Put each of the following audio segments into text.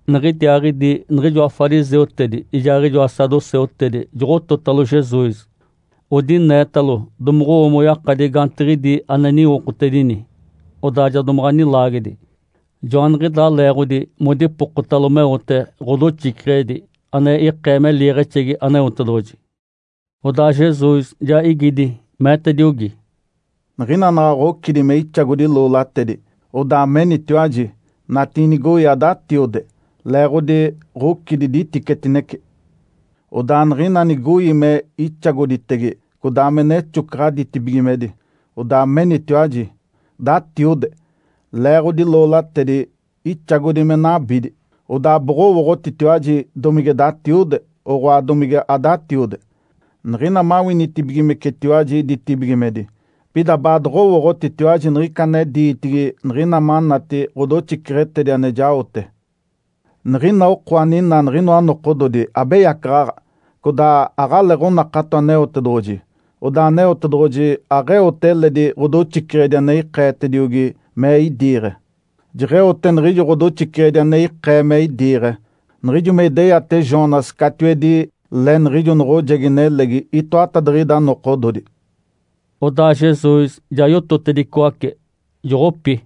Niɡ̶idiaaɡ̶idi niɡ̶ijoa fariseutedi ijaaɡ̶ijoa saduceutedi joɡ̶ototalo Jesus. Odineetalo, domoɡ̶owo moyakadi gaantiɡ̶idi ane niwokotedini, odaa ja domaɡ̶a nilaagedi. Joaniɡ̶idaa leeɡ̶odi modipokotalo meote ɡ̶odoxiceɡ̶edi ane ikee me liiɡ̶exegi Aneotedoɡ̶oji. Odaa Jesus ja igidi, meetediogi, “Niɡ̶ina naɡ̶a ɡ̶ocidi me ixagodi loolatedi, odaa menitiwaji, ‘Natiinigoi adatiode, leeɡ̶odi ɡ̶ocidi diticetinece.’ Odaa niɡ̶ina nigoi me ixagoditege codaa me nexocaɡ̶a ditibigimedi, odaa menitiwaji, ‘Datiode, leeɡ̶odi loolatedi ixagodi me nabidi.’ Odaa boɡ̶owooɡ̶otitiwaji domige datiode, oɡ̶oa domige adatiode, niɡ̶ina mawinitibigimecetiwaji ditibigimedi. Pida baadoɡ̶owooɡ̶otitiwaji niɡ̶ica ane diitigi niɡ̶ina manati ɡ̶odoxiceɡ̶etedi ane jaote. Niɡ̶ina oko aninaa niɡ̶inoa nokododi abeyacaɡ̶aɡ̶a codaa aɡ̶aleeɡ̶onakato Aneotedoɡ̶oji. Odaa Aneotedoɡ̶oji aɡ̶eote eledi ɡ̶odoxiceɡ̶edi ane ikeetiogi me idiiɡ̶e. Jeɡ̶eote niɡ̶ijo ɡ̶odoxiceɡ̶edi ane ikee me idiiɡ̶e, niɡ̶ijo me ideyate Jonas catiwedi le niɡ̶ijo noɡ̶ojegi nelegi itoatadiɡ̶ida nokododi.” Odaa Jesus ja yototedicoace, joɡ̶opi.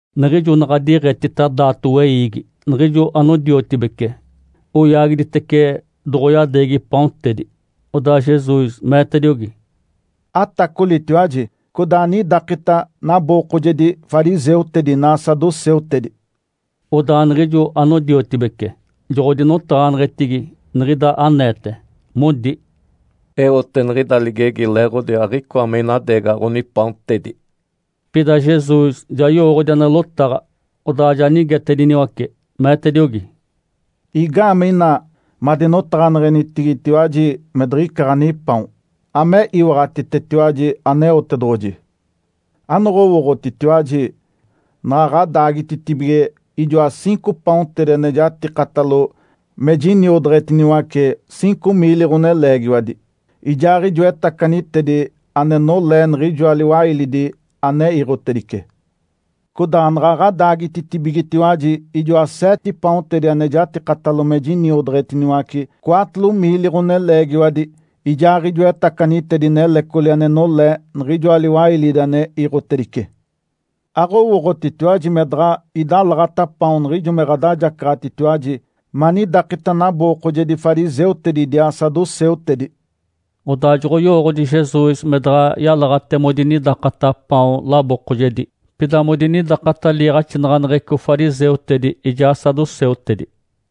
Niɡ̶ijo naɡ̶a diiɡ̶etita daato weiigi niɡ̶ijo anodiotibece, oyaagiditece doɡ̶oyadeegi paontedi. Odaa Jesus meetediogi, “Atacolitiwaji codaa anidakita nabookojedi fariseutedi inaa saduceutedi!” Odaa niɡ̶ijo anodiotibece joɡ̶odinotaɡ̶aneɡ̶etigi niɡ̶ida aneete, modi, “Eote niɡ̶ida ligegi leeɡ̶odi aɡ̶icoa me inadeegaɡ̶a ɡ̶onipaontedi.” Pida Jesus ja yowooɡ̶odi ane lotaɡ̶a, odaa ja nigetediniwace, meetediogi, “Igaamee ina madinotaɡ̶aneɡ̶enitigitiwaji me diɡ̶ica ɡ̶anipaon? Ame iwaɡ̶atitetiwaji Aneotedoɡ̶oji! Anoɡ̶owooɡ̶otitiwaji? Naɡ̶a ɡ̶adaagititibige ijoa ciinco paontedi ane jatikatalo me jiniodeɡ̶etiniwace ciinco miili ɡ̶oneleegiwadi, ijaaɡ̶ijoa etacanitedi ane nolee niɡ̶ijoa liwailidi ane iiɡ̶otedice? Codaa naɡ̶a ɡ̶adaagititibigetiwaji ijoa seete paontedi ane jatikatalo me jiniodeɡ̶etiniwace cwaatolo miili ɡ̶oneleegiwadi, ijaaɡ̶ijoa etacanitedi nelecoli ane nolee niɡ̶ijoa liwailidi ane iiɡ̶otedice? Aɡ̶owooɡ̶otitiwaji me daɡ̶a idalaɡ̶ata paon niɡ̶ijo me ɡ̶adajacaɡ̶atitiwaji manidakita nabookojedi fariseutedi idiaa saduceutedi.” Odaa joɡ̶oyowooɡ̶odi Jesus me daɡ̶a yalaɡ̶ate modinidakata paon labookojedi, pida modinidakata liiɡ̶axinaɡ̶aneɡ̶eco fariseutedi ijaa saduceutedi.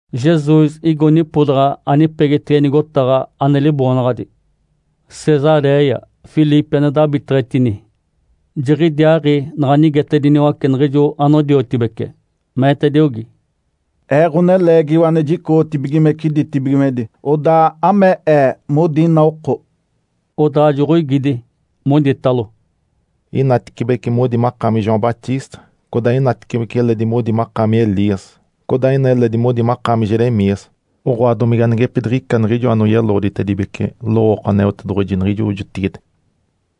Jesus igo nipodaɡ̶a anipegitege nigotaɡ̶a, ane liboonaɡ̶adi “Cesaréia Filipe ane dabiteɡ̶etini”. Jiɡ̶idiaaɡ̶i naɡ̶a nigetediniwace niɡ̶ijo anodiotibece, meetediogi, “Ee, Ǥoneleegiwa ane jicoɡ̶otibigimece ditibigimedi, odaa ame Ee modi ina oko?” Odaa joɡ̶oigidi, moditalo, “Inatecibece modi makaami João Batista, codaa inatecibece eledi modi makaami Elias. Codaa ina eledi modi makaami Jeremias, oɡ̶oa, domige anigepidiɡ̶ica niɡ̶ijo anoyeloɡ̶oditedibece lowooko Aneotedoɡ̶oji niɡ̶ijo jotigide.”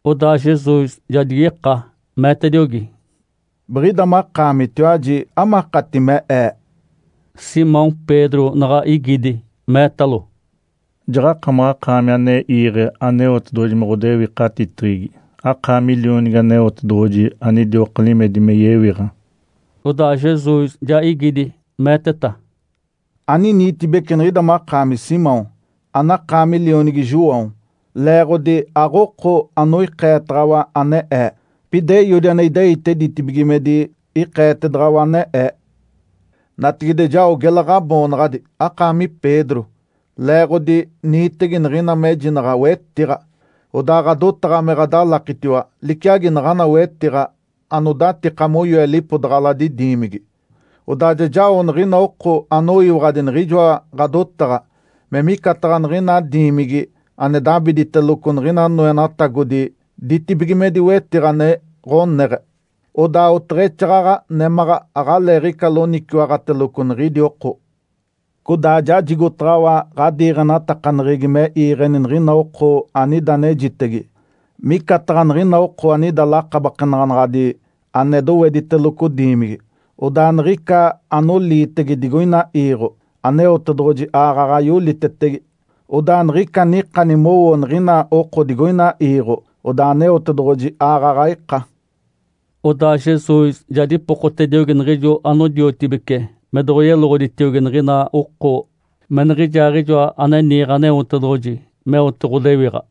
Odaa Jesus ja digika, meetediogi, “Biɡ̶ida makaamitiwaji, amakati me Ee?” Simão Pedro naɡ̶a igidi, meetalo, “Jaɡ̶akamaɡ̶akaami ane iiɡ̶e Aneotedoɡ̶oji me ɡ̶odewikatiteɡ̶egi. Akaami Lionigi Aneotedoɡ̶oji anidioka limedi me yewiɡ̶a.” Odaa Jesus ja igidi, meeteta, “Aniniitibeci niɡ̶ida makaami Simão, anakaami lionigi João, leeɡ̶odi aɡ̶oko anoikeetaɡ̶awa ane Ee, pida Eiodi ane ideite ditibigimedi ikeetedaɡ̶awa ane Ee. Natigide jao gela ɡ̶aboonaɡ̶adi akaami Pedro (leeɡ̶odi niitege niɡ̶ina mejinaɡ̶a wetiɡ̶a). Odaa ɡ̶adotaɡ̶a me ɡ̶adalakitiwa liciagi naɡ̶ana wetiɡ̶a anodatika moyoe lipodaɡ̶aladi diimigi. Odaa ja jao niɡ̶ina oko anoyiwaɡ̶adi niɡ̶ijoa ɡ̶adotaɡ̶a me micataɡ̶a niɡ̶ina diimigi ane dabiteɡ̶eteloco niɡ̶ina noenatagodi ditibigimedi wetiɡ̶a ane ɡ̶oneɡ̶e. Odaa oteɡ̶exaaɡ̶aɡ̶a némaɡ̶a aɡ̶aleeɡ̶ica loniciwaɡ̶ateloco niɡ̶idi oko. Codaa jajigotaɡ̶awa ɡ̶adiiɡ̶enatakaneɡ̶egi me iiɡ̶eni niɡ̶ina oko anida anejitege, micataɡ̶a niɡ̶ina oko anida lakabakenaɡ̶anaɡ̶adi ane dowediteloco diimigi, odaa niɡ̶ica anoliitege digoina iiɡ̶o, Aneotedoɡ̶oji aaɡ̶aɡ̶a yolitetege. Odaa niɡ̶ica anikani mowo niɡ̶ina oko digoina iiɡ̶o, odaa Aneotedoɡ̶oji aaɡ̶aɡ̶a ika.” Odaa Jesus ja dipokotediogi niɡ̶ijo anodiotibece me doɡ̶oyeloɡ̶oditiogi niɡ̶ina oko me Niɡ̶ijaaɡ̶ijoa ane niiɡ̶e Aneotedoɡ̶oji meote ɡ̶odewiɡ̶a.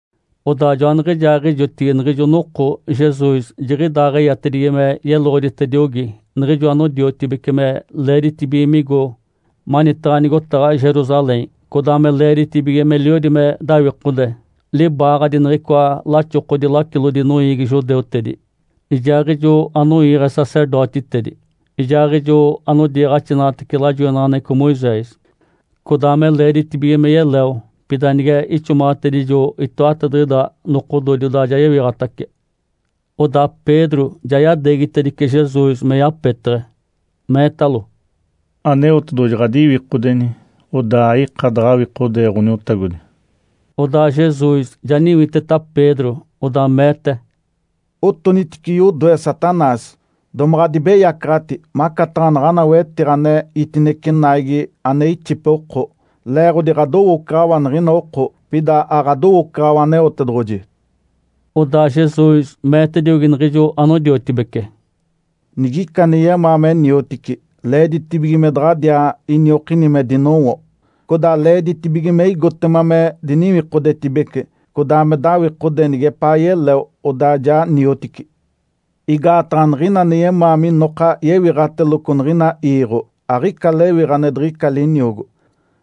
Odaa joaniɡ̶ijaaɡ̶ijotigi niɡ̶ijo noko Jesus jiɡ̶idaaɡ̶eyatedigi me yeloɡ̶oditediogi niɡ̶ijo anodiotibece me leeditibige migo manitaɡ̶a nigotaɡ̶a Jerusalém, codaa me leeditibige meliodi me dawikode libaaɡ̶adi niɡ̶icoa laxokodi lacilodi noiigi judeutedi, ijaaɡ̶ijo anoiiɡ̶e sacerdotitedi, ijaaɡ̶ijo anodiiɡ̶axinaɡ̶atece lajoinaɡ̶aneɡ̶eco Moisés. Codaa me leeditibige me yeleo, pida nige ixomaɡ̶atedijo itoatadiɡ̶ida nokododi, odaa ja yewiɡ̶atace. Odaa Pedro ja yadeegitedice Jesus me yapeteɡ̶e, meetalo, “Aneotedoɡ̶oji ɡ̶adiwikodeni, odaa aika daɡ̶awikodee, Ǥoniotagodi.” Odaa Jesus ja niwiteta Pedro, odaa meete, “Otonitice yodoe, Satanás! Domaɡ̶a adibeyacaɡ̶ati macataɡ̶a naɡ̶ana wetiɡ̶a ane itinece naigi ane ixipe oko, leeɡ̶odi ɡ̶adowoocaɡ̶awa niɡ̶ina oko, pida aɡ̶adowoocaɡ̶awa Aneotedoɡ̶oji.” Odaa Jesus meetediogi niɡ̶ijo anodiotibece, “Nigica ane yemaa me niotici, leeditibige me daɡ̶adiaa iniokini me dinowo, codaa leeditibige me igotema me diniwikodetibece, codaa me dawikode nigepaa yeleo, odaa ja niotici. Igaataɡ̶a niɡ̶ina ane yemaa minoka yewiɡ̶ateloco niɡ̶ina iiɡ̶o, aɡ̶ica lewiɡ̶a ane diɡ̶ica liniogo,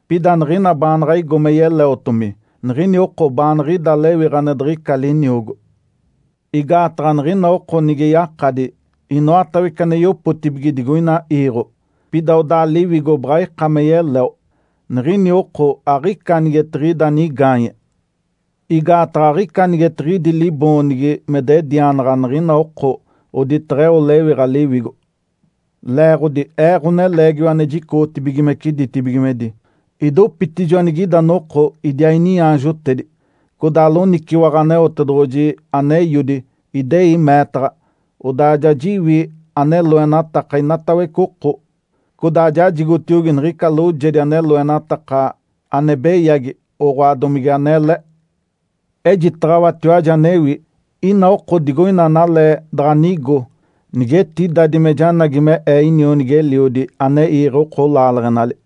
pida niɡ̶ina baanaɡ̶a igo me yeleotomi, niɡ̶ini oko baanaɡ̶a ida lewiɡ̶a ane diɡ̶ica liniogo. Igaataɡ̶a niɡ̶ina oko nige yakadi inoatawece ane yopotibige digoina iiɡ̶o, pida odaa liwigo baɡ̶a ika me yeleo, niɡ̶ini oko aɡ̶ica anigetiɡ̶ida nigaanye. Igaataɡ̶a aɡ̶ica anigetiɡ̶idi liboonigi me dedianaɡ̶a niɡ̶ina oko oditaɡ̶a eo lewiɡ̶a liwigo. Leeɡ̶odi Ee, Ǥoneleegiwa ane jicoɡ̶otibigimece ditibigimedi, idopitijo anigida noko idiaa iniaanjotedi, codaa loniciwaɡ̶a Aneotedoɡ̶oji ane Eiodi, idei meetaɡ̶a. Odaa ja jiwi ane loenataka inatawece oko, codaa jajigotiogi niɡ̶ica loojedi ane loenataka ane beyagi, oɡ̶oa, domige anele. Ejitaɡ̶awatiwaji anewi. Ina oko digoina analee daɡ̶a nigo nigetidadi me janagi me Ee inionigi-eliodi ane iiɡ̶e oko laaleɡ̶enali.”